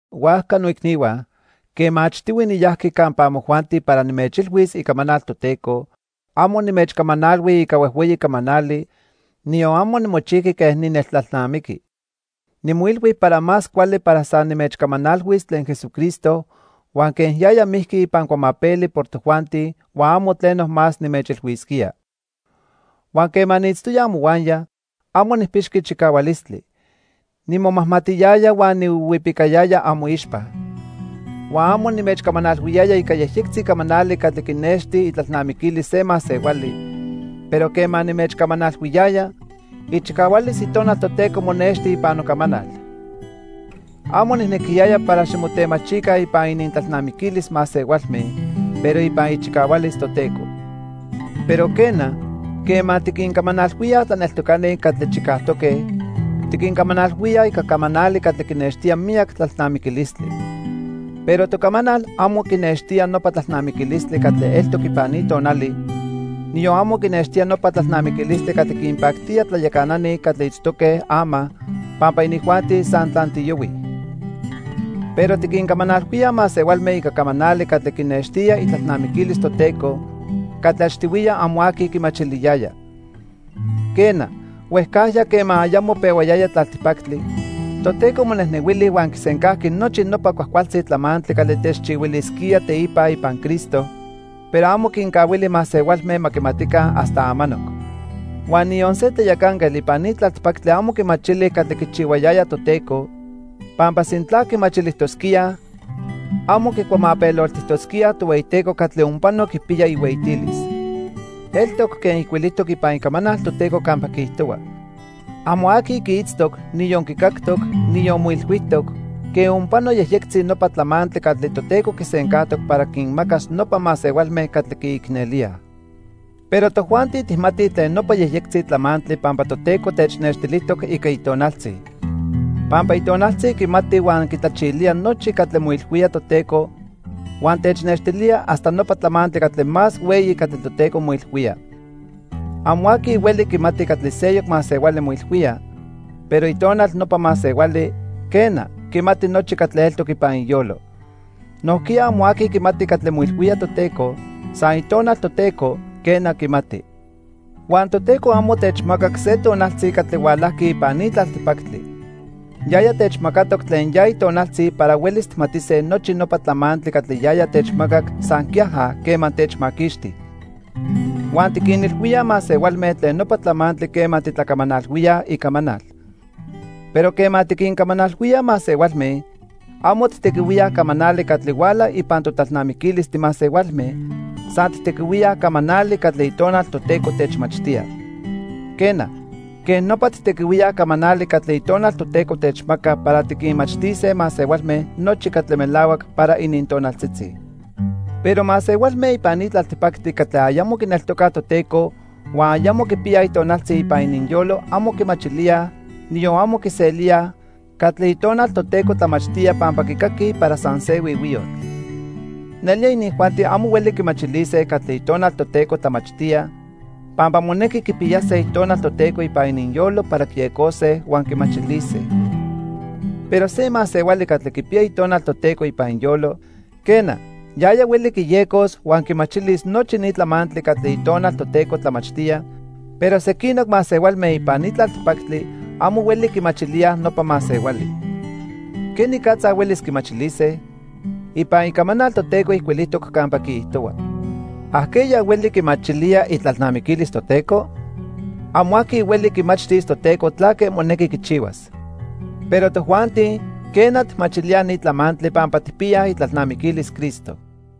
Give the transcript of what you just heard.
Huajca, noicnihua, quema achtihui niyajqui campa amojuanti para nimechilhuis icamanal Toteco, amo nimechcamanalhui ica huejhueyi camanali, niyon amo nimochijqui quen nineltlalnamiqui. Nimoilhui para más cuali para san nimechcamanalhuis tlen Jesucristo huan quen yaya mijqui ipan cuamapeli por tojuanti huan amo tleno más nimechilhuisquía. Huan quema niitztoya amohuaya, amo nijpixqui chicahualistli. Nimomajmatiyaya huan nihuihuipicayaya amoixpa. Huan amo nimechcamanalhuiyaya ica yejyectzi camanali catli quinexti itlalnamiquilis se masehuali, pero quema nimechcamanalhuiyaya, ichicahualis Itonal Toteco monexti ipan nocamanal. Amo nijnequiyaya para ximotemachica ipan inintlalnamiquilis masehualme, pero ipan ichicahualis Toteco. Pero quena, quema tiquincamanalhuíaj tlaneltocani catli chicajtoque, tiquincamanalhuíaj ica camanali catli quinextía miyac tlalnamiquilistli. Pero tocamanal amo quinextía nopa tlalnamiquilistli catli eltoc ipan ni tonali, niyon amo quinextía nopa tlalnamiquilistli catli quinpactía tlayacanani catli itztoque ama pampa inijuanti san tlantiyohuij. Pero tiquincamanalhuíaj masehualme ica camanali catli quinextía itlalnamiquilis Toteco catli achtihuiya amo aqui quimachiliyaya. Quena, huejcajya quema ayamo pehuayaya tlaltipactli, Toteco monejnehuili huan quisencajqui nochi nopa cuajcualtzi tlamantli catli techchihuilisquía teipa ipan Cristo, pero amo quincahuili masehualme ma quimatica hasta amanoc. Huan niyon se tlayacanquetl ipan ni tlaltipactli amo quimachili catli quichihuayaya Toteco, pampa sintla quimachilijtosquíaj, amo quicuamapeloltijtosquíaj Tohueyiteco catli onpano quipiya ihueyitilis. Eltoc quen ijcuilijtoc ipan Icamanal Toteco campa quiijtohua: "Amo aqui quiitztoc, niyon quicactoc, niyon moilhuijtoc, quen onpano yejyectzi nopa tlamantli catli Toteco quisencajtoc para quinmacas nopa masehualme catli quiicnelíaj." Pero tojuanti tijmatij tlen nopa yejyectzi tlamantli pampa Toteco technextilijtoc ica Itonaltzi. Pampa Itonaltzi quimati huan quitlachilía nochi catli moilhuía Toteco huan technextilía hasta nopa tlamantli catli más hueyi catli Toteco moilhuía. Amo aqui hueli quimati catli seyoc masehuali moilhuía, pero itonal nopa masehuali, quena, quimati nochi catli eltoc ipan iyolo. Nojquiya amo aqui quimati catli moilhuía Toteco, san Itonal Toteco, quena, quimati. Huan Toteco amo techmacac se tonaltzi catli hualajqui ipan ni tlaltipactli. Yaya techmacatoc tlen ya Itonaltzi para huelis tijmatise nochi nopa tlamantli catli yaya techmacac san quiaja quema techmaquixti. Huan tiquinilhuíaj masehualme tlen nopa tlamantli quema titlacamanalhuíaj icamanal. Pero quema tiquincamanalhuíaj masehualme, amo tijtequihuíaj camanali catli huala ipan totlalnamiquilis timasehualme, san tijtequihuíaj camanali catli Itonal Toteco techmachtía. Quena, quej nopa tijtequihuíaj camanali catli Itonal Toteco techmaca para tiquinmachtise masehualme nochi catli melahuac para inintonaltzitzi. Pero masehualme ipan ni tlaltipactli catli ayamo quineltocaj Toteco huan ayamo quipiyaj Itonaltzi ipan ininyolo amo quimachilíaj, niyon amo quiselíaj, catli Itonal Toteco tlamachtía pampa quicaquij para san se huihuiyotl. Nelía inijuanti amo hueli quimachilise catli Itonal Toteco tlamachtía pampa monequi quipiyase Itonal Toteco ipan ininyolo para quiyecose huan quimachilise. Pero se masehuali catli quipiya Itonal Toteco ipan iyolo, quena, yaya hueli quiyecos huan quimachilis nochi ni tlamantli catli Itonal Toteco tlamachtía, pero sequinoc masehualme ipan ni tlaltipactli amo hueli quimachilíaj nopa masehuali. ¿Quenicatza huelis quimachilise? Ipan Icamanal Toteco ijcuilijtoc campa quiijtohua: "¿Ajqueya hueli quimachilía itlalnamiquilis Toteco? Amo aqui hueli quimachtis Toteco tlaque monequi quichihuas." Pero tojuanti, quena, tijmachilíaj ni tlamantli pampa tijpiyaj itlalnamiquilis Cristo.